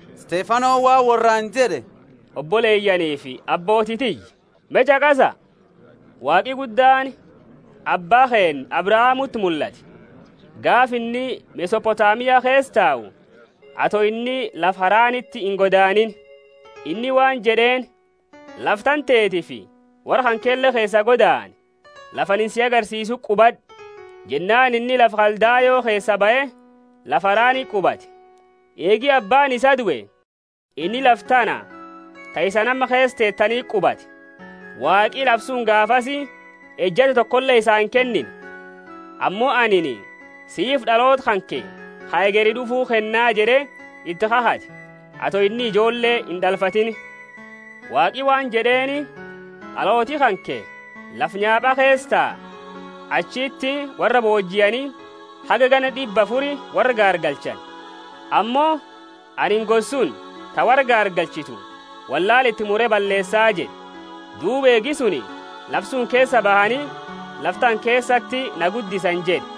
Stefanoni waan worraani jed'e, Oboleyaanifi abbooti tiyya, me ch'aqasa! Waaqi Guddaani abba keenna Abrahamuti mullate, gaafa inni Mesopotamia keesa tau, ato inni lafa Haraniti ingodaaniini. Inni waan jed'eeni, Lafa tantetiifi worra kankele keesaa godaani, lafa anini sii agarsiisuti qubad'i. Jennaani inni lafa Kaldayo keesaa bahe lafa Harani qubate. Eegi abbaani isaa due, inni lafa tana ta isani amma keesa tetaniti qubate. Waaqi lafa suni gaafasi ejata tokole isaa inkennine, ammo Anini siifi d'aloota kanke ka hegeri d'ufuu kenna jed'e iti kakhate ato inni ijoolle ind'alfatini. Waaqi waan jed'eeni, D'alooti kanke lafa nyaapaa keesa taa, achiti worra boojiani haga ganna d'ibba afuri worra gaargalchani. Ammo, anini gosa suni ta worra gaargalchitu wollaala iti mure balleesa jed'e, duuba eegi suni lafa suni keesaa bahani lafa tana keesati na guddisani jed'e.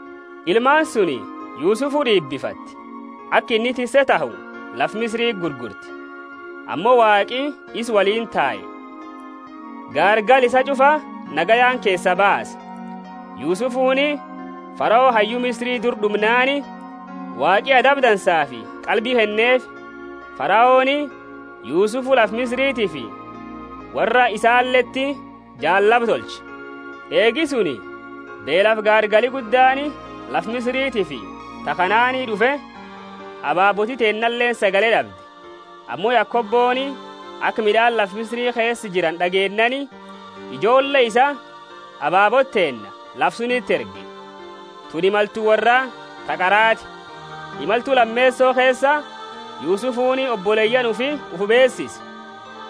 Ilmaani suni Yusufu d'iibifate, aka inni tisse tahu lafa Misiriti gurgurte. Ammo Waaqi isa woliini tae, gaargala isaa ch'ufa nagayaani keesaa baase. Yusufuni Farao hayyu Misiri dura d'umnaani, Waaqi adaba dansaafi qalbi kenneefi. Faraoni Yusufu lafa Misiritiifi worra isaaleti jaallaba tolche. Eegi suni beelafi gaargali guddaani lafa Misiritiifi ta Kanaani d'ufe ababooti teennaleeni sagale d'abde. Ammo Yakoboni aka mid'aani lafa Misiri keesa jirani d'ageennaani ijoolle isa, ababoota teenna, lafa suniti erge, tuni imaltu worraa ta qarati. Imaltu lameeso keesa, Yusufuni oboleyaani ufii ufi beesise,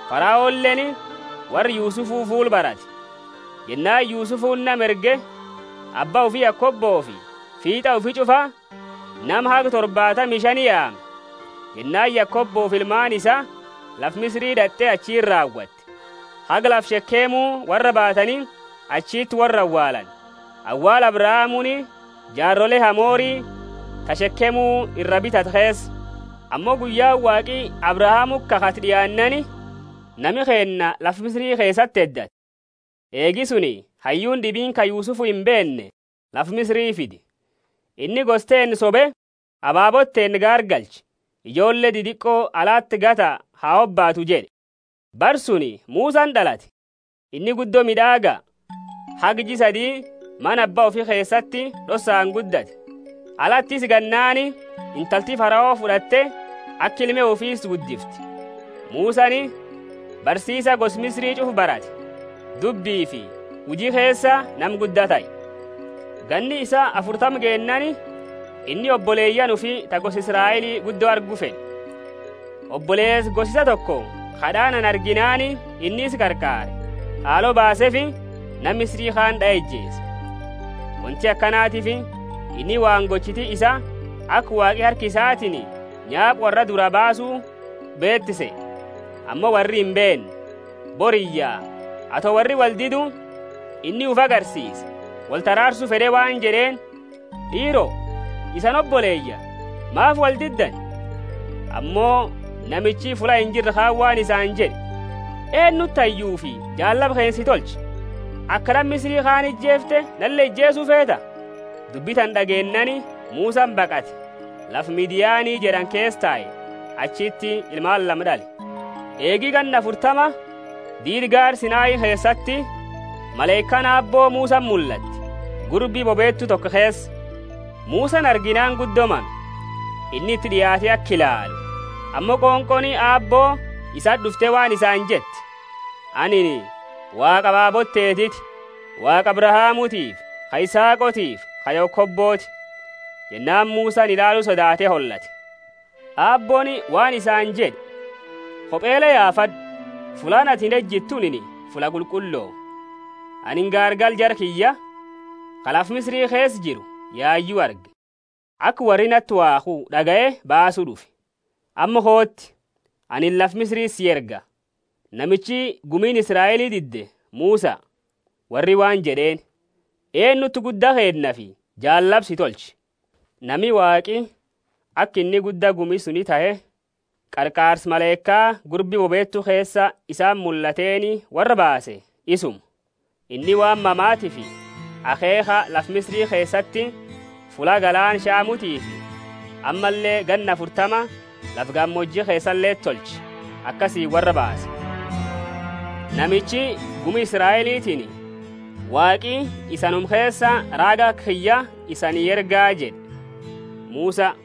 Faraoleeni worra Yusufu fuula barate. Jennaani Yusufuni nama erge, abba ufi Yakobofi fiit'a ufii ch'ufa, nama haga torbaatami shani yaame. Jennaani Yakobofi ilmaani isaa lafa Misiri d'at'e achiti raawate. Haga lafa Shekemu worra baatani achiti worra awaalani, awaala Abrahamuuni jaarole Hamori ta Shekemu ira bitate keesa. Ammo guyyaani Waaqi Abrahamuti kakhate d'iaannaani, nami keenna lafa Misiri keesati heddate. Eegi suni hayyuuni d'ibiini ka Yusufu imbeenne lafa Misiri fide. Inni gosa teenna sobe, ababoota teenna gaargalche, ijoolle didiqo alati gata ha hobaatu jed'e. Bara suni Musani d'alate, inni guddo mid'aaga, haga jia sadi mana abba ufi keesati d'ossaani guddate. Alati isa gannaani, intalti Farao fud'atte aka ilme ufii isa guddifte. Musani barsiisa gosa Misiri ch'ufa barate, dubbifi huji keesa nama gudda tahe. Ganni isaa afurtama geennaani, inni oboleyaani ufii, ta gosa Israeli, guddo argu fed'e. Oboleesa gosa isaa toko ka d'aanani arginaani inni isa qarqaare, haalo baaseefi, nama Misiri kaani d'ae ijeese. Wonti akanatiifi inni waan gochiti isaa aka Waaqi harka isatiini nyaapa worraa duraa baasu beetu sehe; ammo worri imbeenne. Boriyya ato worri woldidu, inni ufi agarsiise, wolti araarsu fed'e waan jed'eeni, D'iiro, isani oboleyaani, maafi woldiddani? Ammo namichi fulla injirre kaani waan isaani jed'e, Eenuti hayyufi jaallaba keenna si tolche? Aka nama Misiri kaani ijeefte nale ijeesu feeta? Dubbi tana d'ageennaani Musani baqate, lafa Midiani jed'ani keesa tae, achiti ilmaani lama d'ale. Eegi ganna afurtama, diida gaara Sinai keesati, malaikaani Aabbo Musati mullatte, gurbi bobeetu toko keesa. Musani arginaani guddo mame. Inni iti d'iaate aka ilaalu, ammo qonqooni Aabbo isati d'ufte waan isaani jette. Anini Waaqa ababoota teetiti, Waaqa Abrahamutiifi ka Isaaqoti ka Yakoboti. Jennaani Musani ilaalu sodaate holate. Aabbooni waan isaani jed'e, Kopele yaafad'u, fullaani atini ejitu tunini fulla qulqullo. Anini gaargala jara kiyya, ka lafa Misiri keesa jiru, yayu arge, aka worri nati waakhu d'agaye baasu d'ufe. Amma kooti, anini lafa Misiriti sii erga. Namichi gumiini Israeli didde Musa. Worri waan jed'eeni, Eenuti gudda keennafi jaallaba si tolche? Nami Waaqi aka inni gudda gumi suni tahe, qarqaarsa malaika gurbi bobeetu keesa isati mullateni worraa baase isuma; inni waan mamatiifi akheekha lafa Misiri keesati fulla galaana Shamutiifi ammalle ganna afurtama lafa gamooji keesaleti tolche, akasiini worra baase. Namichi gumi Israelitiini, Waaqi isanuma keesa raaga aka kiyya isanii erga jed'e Musa.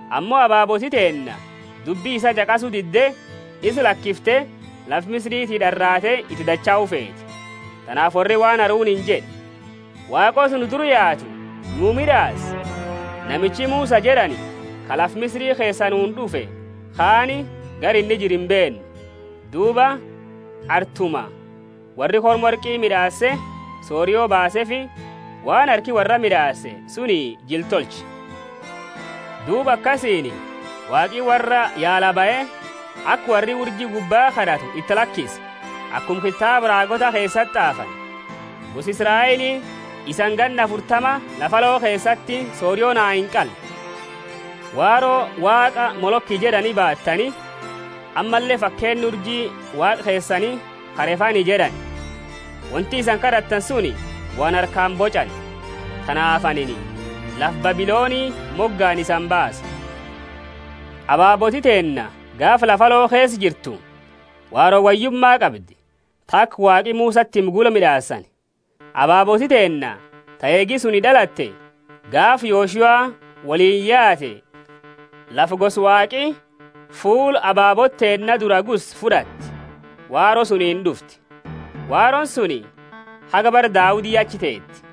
Ammo ababooti teenna dubbi isa ch'aqasu didde isa lakifte lafa Misiriti d'araate iti dachau feete. Tanaafi worri waan Haruniini jed'e, Waaqoota nu dura yaatu nuu mid'aasi namichi Musa jed'ani ka lafa Misiri keesa nuuni d'ufe kaani gara inni jiru imbeennu. Duuba artuma worri korma worqi mid'aase, sorio baaseefi waan harki worraa mid'aase suni jila tolche. Duuba akasiini Waaqi worra yaala bahe, aka worri urji gubbaa kad'atu iti lakise, akuma kitaaba raagoota keesati t'aafani, Gosa Israeli, isani ganna afurtama lafa aloo keesati sorio naa inqalle. Waaro waaqa Moloki jed'ani baatani, ammalle fakeenna urji waaqa keesani ka Refani jed'ani; wonti isani kad'attani suni waan harkaani boch'ani. Tanaafi anini lafa Babiloni mogaani isani baasa. Ababooti teenna gaafa lafa aloo keesa jirtu, Waaro Woyyuma qabdi, ta aka Waaqi Musati hime gula mid'aasani. Ababooti teenna ta eegi suni d'alate gaafa Yoshua woliini yaate lafa gosa Waaqi fulla ababoota teenna duraa gusse fud'ate, Waaro sunini d'ufte. Waarooni suni haga bara Daudi achi teete.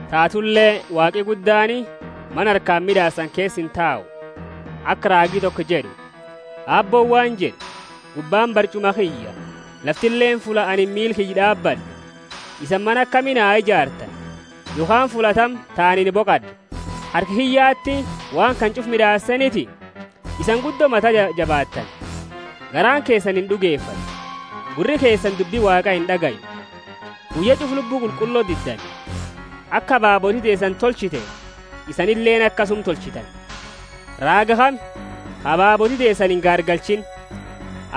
Tatule Waaqi guddaani mana harkaani mid'aasani keesa intau; aka raagi toko jed'u, Aabbooni waan jed'u, Gubbaani barch'uma kiyya, laftileeni fulla anini miila kiyya d'aabad'u. Isani mana akami na ijaartani? Yokhaani fulla tami ta anini boqad'u? Harka kiyyati waan kana ch'ufa mid'aaseeniti? Isani guddo mata jabaattani, garaani keesani ind'ugefatu! Gurri keesani dubbi Waaqa ind'agayu! Guyya ch'ufa Lubbu Qulqullo diddani; aka ababooti teesani tolchite, isanileeni akasuma tolchitani. Raaga kami ka ababooti teesani ingaargalchiini?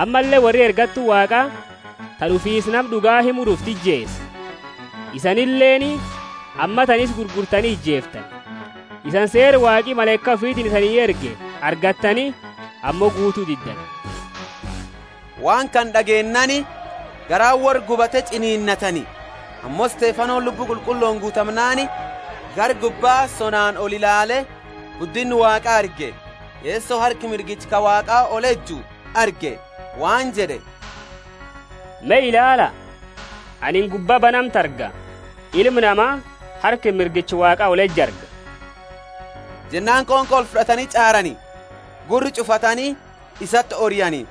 Ammalle worri ergattu Waaqa, ta d'ufiisa Nama d'uga himu d'ufte, ijeese. Isanileeni ammatana isa gurgurtani ijeeftani. Isani seera Waaqi malaika ufitiini isanii erge argattani, ammo guutu diddani! Waan kana d'ageennaani, garaani worra gubate ch'ininnatani. Ammo Stefanoni Lubbu Qulqullooni guutamnaani, gara gubba sonaani olilaale, guddinna Waaqa arge, Yeso harka mirgicha ka Waaqa oleju arge waan jed'e, Me ilaala, anini gubba banamtu arga, Ilma Nama harka mirgicha Waaqa oleju arga. Jennaani qonqo olfud'atani ch'aarani, gurra ch'uqaalatani, isati oriani,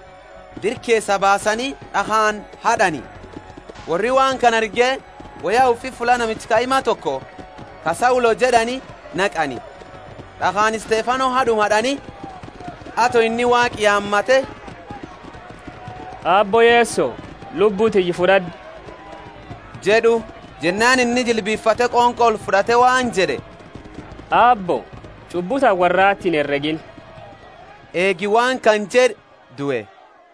dira keesaa baasani, d'akhaani had'ani. Worri waan kana arge woya ufi fulla namicha kaima toko ka Saulo jed'ani naqani. D'akhaani Stefano had'uma had'ani, ato inni Waaqa yaamate, Aabbo Yeso, lubbu tiyya fud'ad'u jed'u. Jennaani inni jilbifate qonqo olfud'ate waan jed'e, Aabbo, ch'ubbu tana worrati inheregiini. Eegi waan kana jed'e due.